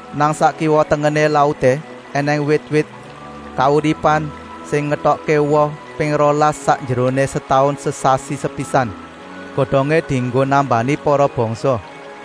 Nang sak kiwa-tengené lauté ènèng wit-wit kauripan sing ngetokké woh ping rolas sakjeroné setaun, sesasi sepisan. Godongé dienggo nambani para bangsa.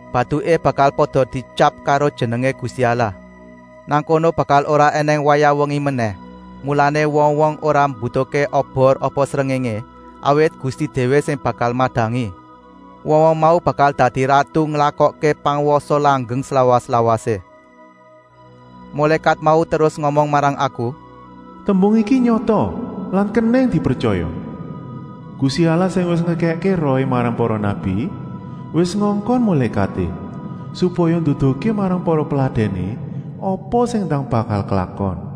Batuké bakal pada dietyap karo jenengé Gusti Allah. Nang kono bakal ora ènèng wayah wengi menèh, mulané wong-wong ora mbutuhké obor apa srengéngé, awit Gusti déwé sing bakal madangi. Wong-wong mau bakal dadi ratu nglakokké pangwasa langgeng slawas-lawasé. Mulékat mau terus ngomong marang aku: “Tembung iki nyata lan kenèng dipretyaya. Gusti Allah sing wis ngekèkké Rohé marang para nabi, wis ngongkon mulékaté, supaya nduduhké marang para peladèné apa sing ndang bakal klakon.”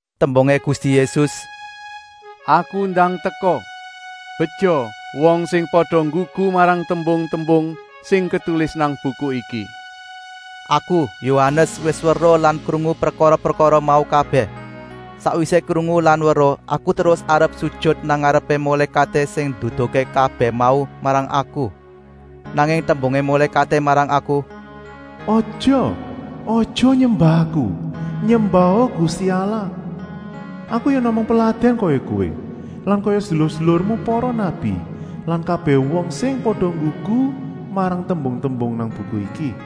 Tembungé Gusti Yésus: “Aku ndang teka. Beja wong sing pada nggugu marang tembung-tembung sing ketulis nang buku iki.” Aku, Yohanes, wis weruh lan krungu prekara-prekara mau kabèh. Sakwisé krungu lan weruh, aku terus arep sujut nang ngarepé mulékaté sing nduduhké kabèh mau marang aku. Nanging tembungé mulékaté marang aku: “Aja! Aja nyembah aku. Nyembaha Gusti Allah. Aku ya namung peladèn kaya kowé lan kaya sedulur-sedulurmu para nabi lan kabèh wong sing pada nggugu marang tembung-tembung nang buku iki!”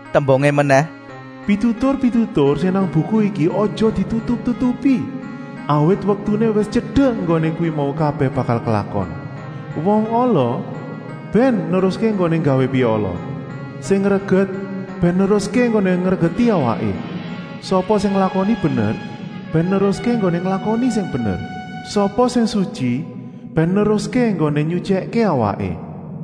Tembungé menèh: “Pitutur-pitutur sing nang buku iki aja ditutup-tutupi, awit wektuné wis tyedek enggoné kuwi mau kabèh bakal klakon. Wong ala bèn neruské enggoné nggawé piala, sing reget bèn neruské enggoné ngregeti awaké. Sapa sing nglakoni bener bèn neruské enggoné nglakoni sing bener. Sapa sing sutyi bèn neruské enggoné nyutyèkké awaké.”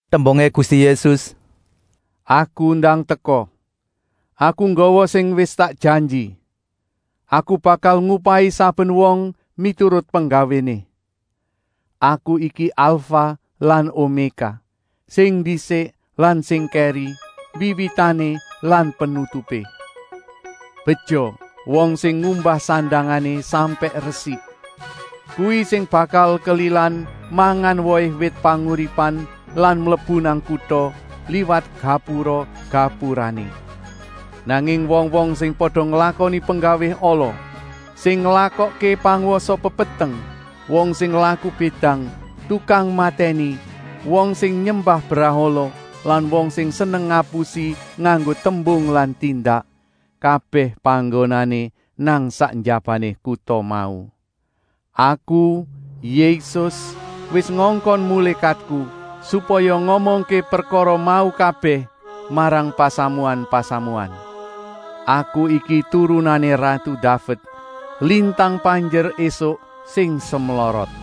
Tembungé Gusti Yésus: “Aku ndang teka. Aku nggawa sing wis tak janji. Aku bakal ngupahi saben wong miturut penggawéné. Aku iki Alfah lan Omékah, sing ndisik lan sing kèri, Wiwitané lan Penutupé.” Beja wong sing ngumbah sandangané sampèk resik. Kuwi sing bakal kelilan mangan wohé wit panguripan lan mlebu nang kuta, liwat gapura-gapurané. Nanging wong-wong sing pada nglakoni penggawé ala, sing nglakokké pangwasa pepeteng, wong sing laku bédang, tukang matèni, wong sing nyembah brahala lan wong sing seneng ngapusi nganggo tembung lan tindak, kabèh panggonané nang sak njabané kuta mau. “Aku, Yésus, wis ngongkon mulékatku, supaya ngomongké prekara mau kabèh marang pasamuan-pasamuan. Aku iki turunané ratu Daved, lintang panjer ésuk sing semlorot.”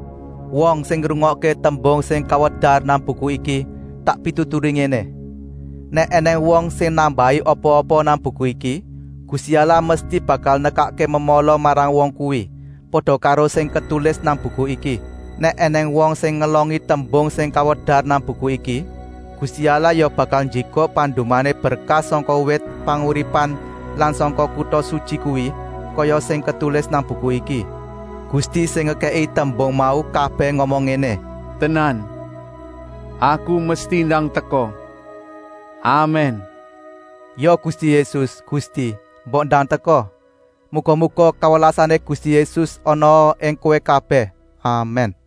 Wong sing ngrungokké tembung sing kawedar nang buku iki tak pituturi ngéné: “Nèk ènèng wong sing nambahi apa-apa nang buku iki, Gusti Allah mesti bakal nekakké memala marang wong kuwi, pada karo sing ketulis nang buku iki. Nèk ènèng wong sing ngelongi tembung sing kawedar nang buku iki, Gusti Allah ya bakal njikuk pandumané berkah sangka wit panguripan lan sangka kuta sutyi kuwi, kaya sing ketulis nang buku iki.” Gusti sing ngekèki tembung mau kabèh ngomong ngéné: “Tenan, Aku mesti ndang teka! Amèn.” Ya Gusti Yésus, Gusti, mbok ndang teka! Muga-muga kawelasané Gusti Yésus anaa ing kowé kabèh! Amèn.